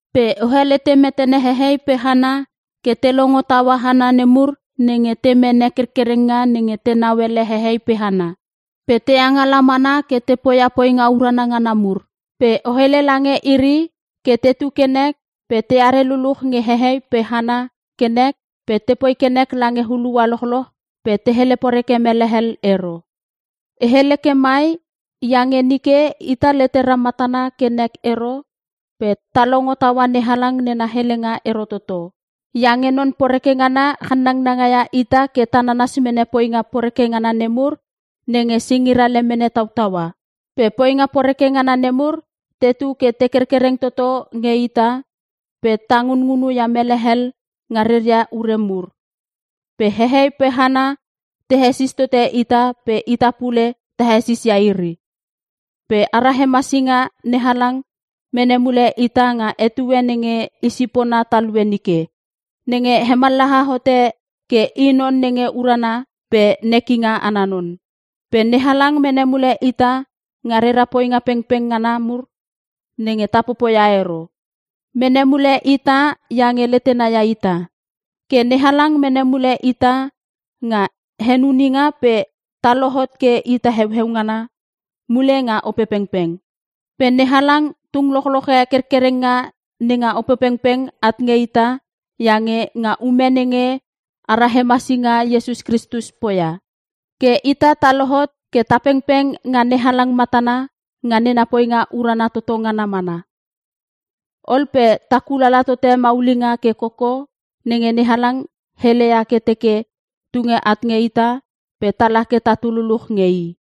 Pe o helete metene hehei pe hana ke te longo taua hana nemur nenge te mene kerkerenga nenge tenau ele hehei pe hana. Pe te angala mana ke te poia poinga urana ngana mur. Pe o hele lange iri ke tetu ke nek pe teare luluch nge hehei pe hana ke nek pe tepoi ke nek lange hulua lochloch pe te hele poreke mele hel ero. E hele ke mai iange nge nike ita letera matana ke nek ero pe ta longo taua NeHalang nena helenga ero toto. Iange non poreke ngana channanga ia ita ke ta nanas mene poinga poreke ngana nemur nenge singira lemene tautaua. Pe poinga poreke ngana nemur tetu ke te kerkereng toto nge ita pe ta ngunngunu ia mele hel nga reria ure mur. Pe hehei pe hana te hesis tote ita pe ita pule ta hesisis ia iri. Pe ara hemasinga NeHalang mene mule ita nga etue nenge i sipona talue nike. Nenge hemallaha hote ke i non nge urana pe i nekinga ana non. Pe NeHalang mene mule ita nga rera poinga pengpeng ngana mur nenge ta popoia ero. Mene mule ita iange letena ia ita. Ke NeHalang mene mule ita nga henuninga pe ta lohot ke ita heueu ngana mule nga Opepengpeng. Pe NeHalang tung lochloche kerkerenga nenga Opepengpeng at nge ita iange nga ume nenge ara hemasinga Iesus Kristus poia. Ke ita ta lohot ke ta pengpeng nga NeHalang matana nga nena poinga urana toto ngana mana. Ol pe ta kulala tote maulinga ke koko nenge NeHalang heleia ke teke tunge at nge ita pe tala ke tatu luluch nge I.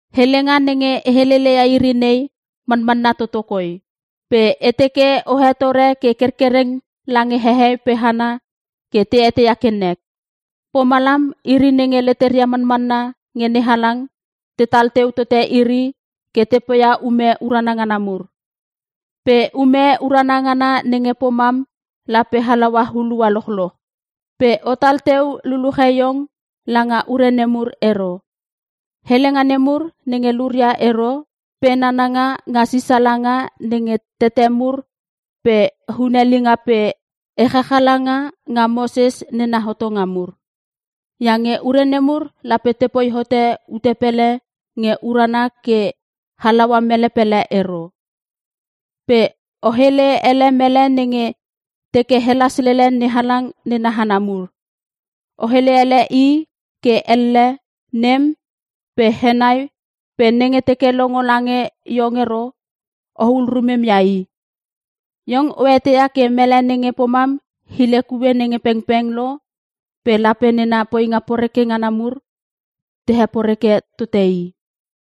Helenga nenge e heleleia iri nei manmanna toto koi. Pe e teke o hetore ke kerkereng lange hehei pe hana ke te eteia ke nek. Pomalam iri nenge leteria manmanna nge NeHalang tetal teu tote iri ke te poia ume urana ngana mur. Pe ume urana ngana nenge pomam lape halaua hulua lochloch. Pe otal teu luluche iong langa ure nemur ero; helenga nemur nenge luria ero pe nananga nga sisala nga nenge tete mur pe hunelinga pe echachalanga nga Moses nena hotonga mur. Iange ure nemur lape tepoi hote ute pele nge urana ke halaua mele pele ero. Pe o hele ele mele nenge te teke helas lele NeHalang nena hana mur. O hele ele i ke elle, nem pe henai pe nenge teke longo lange iong ero ohul rumem ia i. Iong o eteia ke mele nenge pomam hile kue nge pengpeng lo pe lape nena poinga poreke ngana mur te heporeke tote i.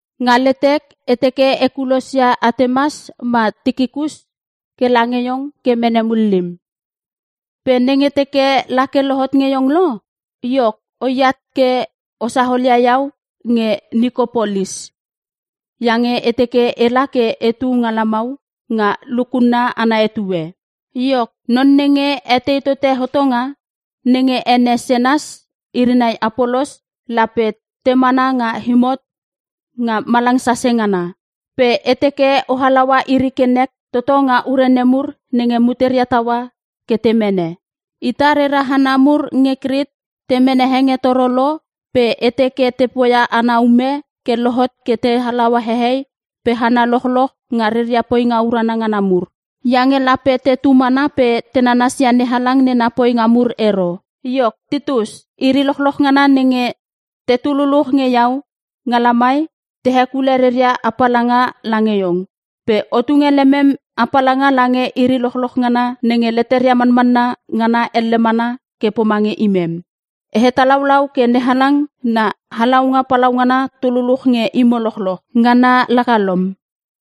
Nga letek e teke e kulosia Atemas ma Tikikus ke lange iong ke mene mullim. Pe nenge teke la ke lohot nge iong lo, iok oiat ke o saolia iau nge Nikopolis. Iange e teke ela ke etu nga lamau nga lukunna ana etue. Iok, non nenge etei tote hotonga, nenge ene Senas iri nai Apolos lape te mana nga imot nga malang sase ngana. Pe e teke o halaua iri ke nek toto nga ure nemur nenge muteria taua ke te mene. Ita rera hana mur nge Krit te mene hengetoro lo pe e teke te poia ana ume ke lohot ke te halaua hehei pe hana lochloch nga reria poinga urana ngana mur. Iange lape tetu mana pe te nanasia NeHalang nena poinga mur ero. Iok Titus, iri lochloch ngana nenge te tululuch nge iau nga lamai te hekule reria apalanga lange iong. Pe o tunge lemem apalanga lange iri lochloch ngana nenge leteria manmanna ngana elle mana ke pomange imem. E hatalaulau ke NeHalang na halaunga palaungana tululuch nge imo lochloch. Ngana laka lom.